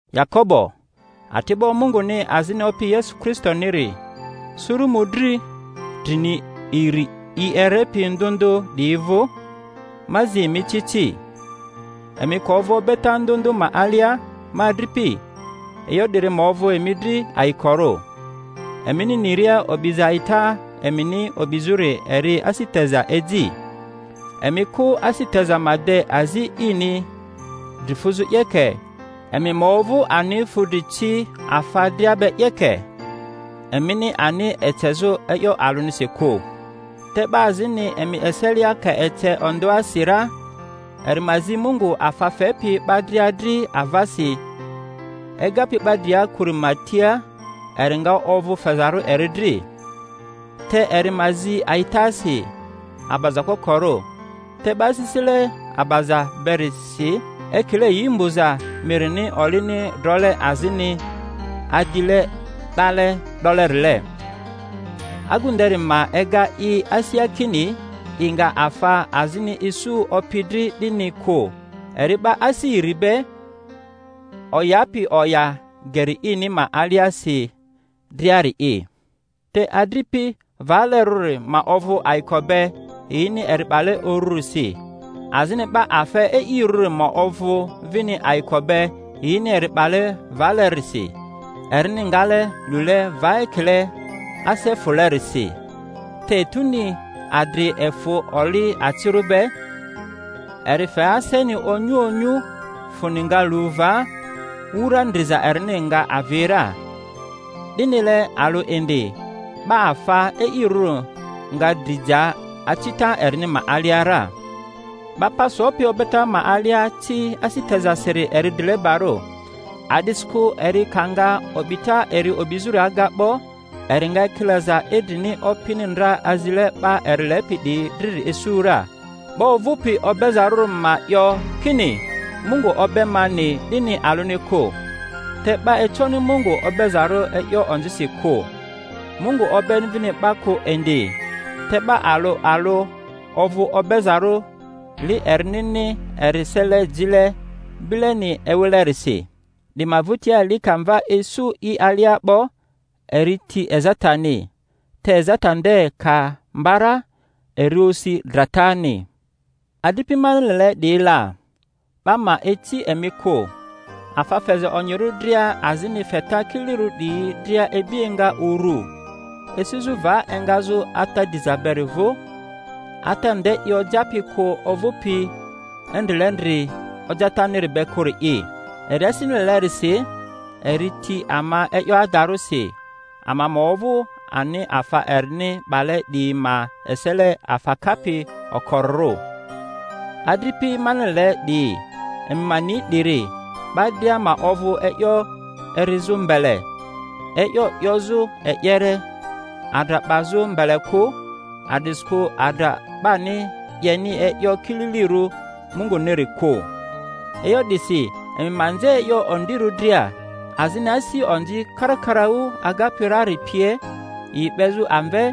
Yakobo, ati'bo Munguni azini Opi Yesu Kristoniri, Suru mᴜdri drini iri yi erepi ndᴜ ndᴜ 'diyi vᴜ: Ma zi emi ci ci. Emi ka ovᴜ obeta ndᴜ ndᴜ ma alia, ma adripi, e'yo 'diri ma ovᴜ emi dri ayikorᴜ, emini niria o'biza a'ita emini o'bizᴜri eri asi teza eji. Emi kᴜ asi teza ma de azi ini dri fuzᴜ 'yeke, emi ma ovᴜ ani fudri ci afa dria be 'yeke, emini ani ecezᴜ e'yo alᴜnisi kᴜ. Te 'ba azini emi eselia ka ece ondᴜasi ra, eri ma zi Mungu afa fepi 'ba dria dri avasi, egapi 'ba dria kᴜri ma tia, eri nga ovᴜ fezarᴜ eri dri. Te eri ma zi a'itasi, abaza kokorᴜ, te 'ba asisile abaza beri si ekile yi mbᴜza mirini olini drole azini adile 'dale 'dolerile. Agu nderi ma ega i asia kini i nga afa azini isu Opi dri, 'dini kᴜ; eri 'ba asi iri be, oyapi oya geri ini ma aliasi driari'i. Te adripi valerᴜri ma ovᴜ ayiko be yini eri 'bale urᴜrisi, azini 'ba afa e'irᴜri ma ovᴜ vini ayiko be yini eri 'bale valerisi, erini ngale lule va ekile ase fᴜlerisi. Te etuni adri efᴜ oli acirᴜ be, eri fe aseni 'onyu onyu; fᴜni nga lu va, wura ndriza erini nga avi ra. 'Dinile alᴜ indi 'ba afa e'irᴜri nga dri ja acita erini ma alia ra. 'Ba pa sopi obeta ma alia ci asi tezasiri eri drilebarᴜ, a'disikᴜ eri ka nga o'bita eri o'bizᴜri aga 'bo, eri nga ekilaza idrini Opini ndra azile 'ba eri lepi 'diyi driri isu ra. 'Ba ovᴜpi obezaruri ma 'yo kini, Mungu obe mani, 'dini alᴜni kᴜ; te 'ba econi Mungu obezarᴜ e'yo onzisi kᴜ, Mungu obeni vini 'ba kᴜ indi; te 'ba alᴜ alᴜ ovᴜ obezarᴜ li erinini eri sele jile bileni ewilerisi. 'Di ma vᴜtia, li ka mva isu i alia 'bo, eri ti ezatani; te ezata nde ka mba ra, eri osi dratani. Adripi mani lele 'diyi la, 'ba ma ici emi kᴜ. Afa feza onyirᴜ dria, azini feta kililirᴜ 'diyi dria ibi enga urᴜ, esizᴜ va engazᴜ Ata diza beri vᴜ, Ata nde i ojapi kᴜ ovᴜpi endrilendri ojataniri be kᴜri'i. Eri asini lelerisi, eri ti ama e'yo adarᴜrisi, ama ma ovᴜ ani afa erini 'bale 'diyi ma esele afa kapi okorirᴜ. Adripi mani lele 'diyi, emi ma ni 'diri. 'Ba dria ma ovᴜ e'yo erizᴜ mbele, e'yo 'yozᴜ e'yere, adra 'bazu mbele kᴜ, a'disikᴜ adra 'bani 'yeni e'yo kililirᴜ Munguniri kᴜ. E'yo 'disi emi ma nze e'yo ondirᴜ dria, azini asi onzi karakaraᴜ agapi rari pie, yi 'bezᴜ amve,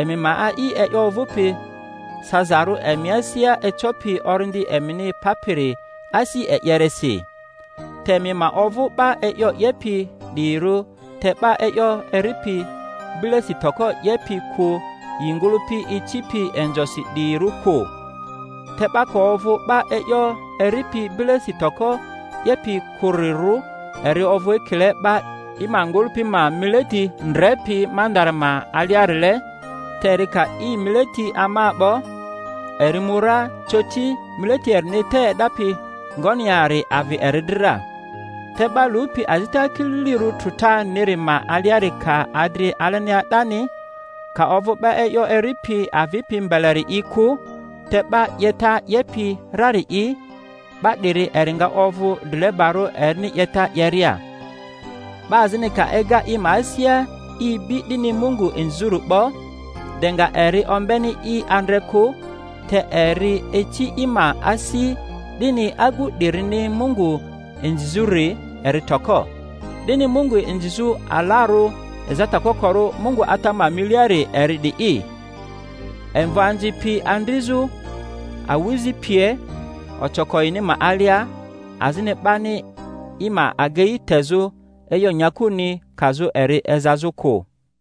emi ma a'i e'yo ovᴜpi sazarᴜ emi asia ecopi orindi emini papiri asi e'yeresi. Te emi ma ovᴜ 'ba e'yo 'yepi 'diyirᴜ, te 'ba e'yo eripi bilesi toko 'yepi kᴜ yi ngᴜlᴜpi icipi inzosi 'diyirᴜ kᴜ. Te 'ba ka ovᴜ 'ba e'yo eripi bilesi toko 'yepi kᴜrirᴜ, eri ovᴜ ekile 'ba i ma ngᴜlᴜpi ma mileti ndrepi mandara ma aliarile; te eri ka i mileti ama 'bo, eri mu ra, coti mileti erini te e'dapi ngoni yari avi eri dri ra. Te 'ba lupi azita kililirᴜ trᴜtaniri ma aliari, ka adri alenia 'dani, ka ovᴜ 'ba e'yo eripi avipi mbeleri'i kᴜ, te 'ba 'yeta 'yepi rari'i, 'ba 'diri eri nga ovᴜ drilebarᴜ erini 'yeta 'yeria. 'Ba azini ka ega i ma asia i bi dini Mungu inzizᴜri 'bo, de nga eri ombeni i andre kᴜ, te eri ici i ma asi, dini agu 'dirini Mungu inzizᴜri eri toko. Dini Mungu inzizᴜ alarᴜ ezata kokorᴜ Mungu Ata ma miliari eri 'di'i: imvoanzi pi andrizᴜ awᴜzi pie ocoko yini ma alia, azini 'bani i ma agei tezᴜ e'yo nyakuni kazᴜ eri ezazᴜ kᴜ.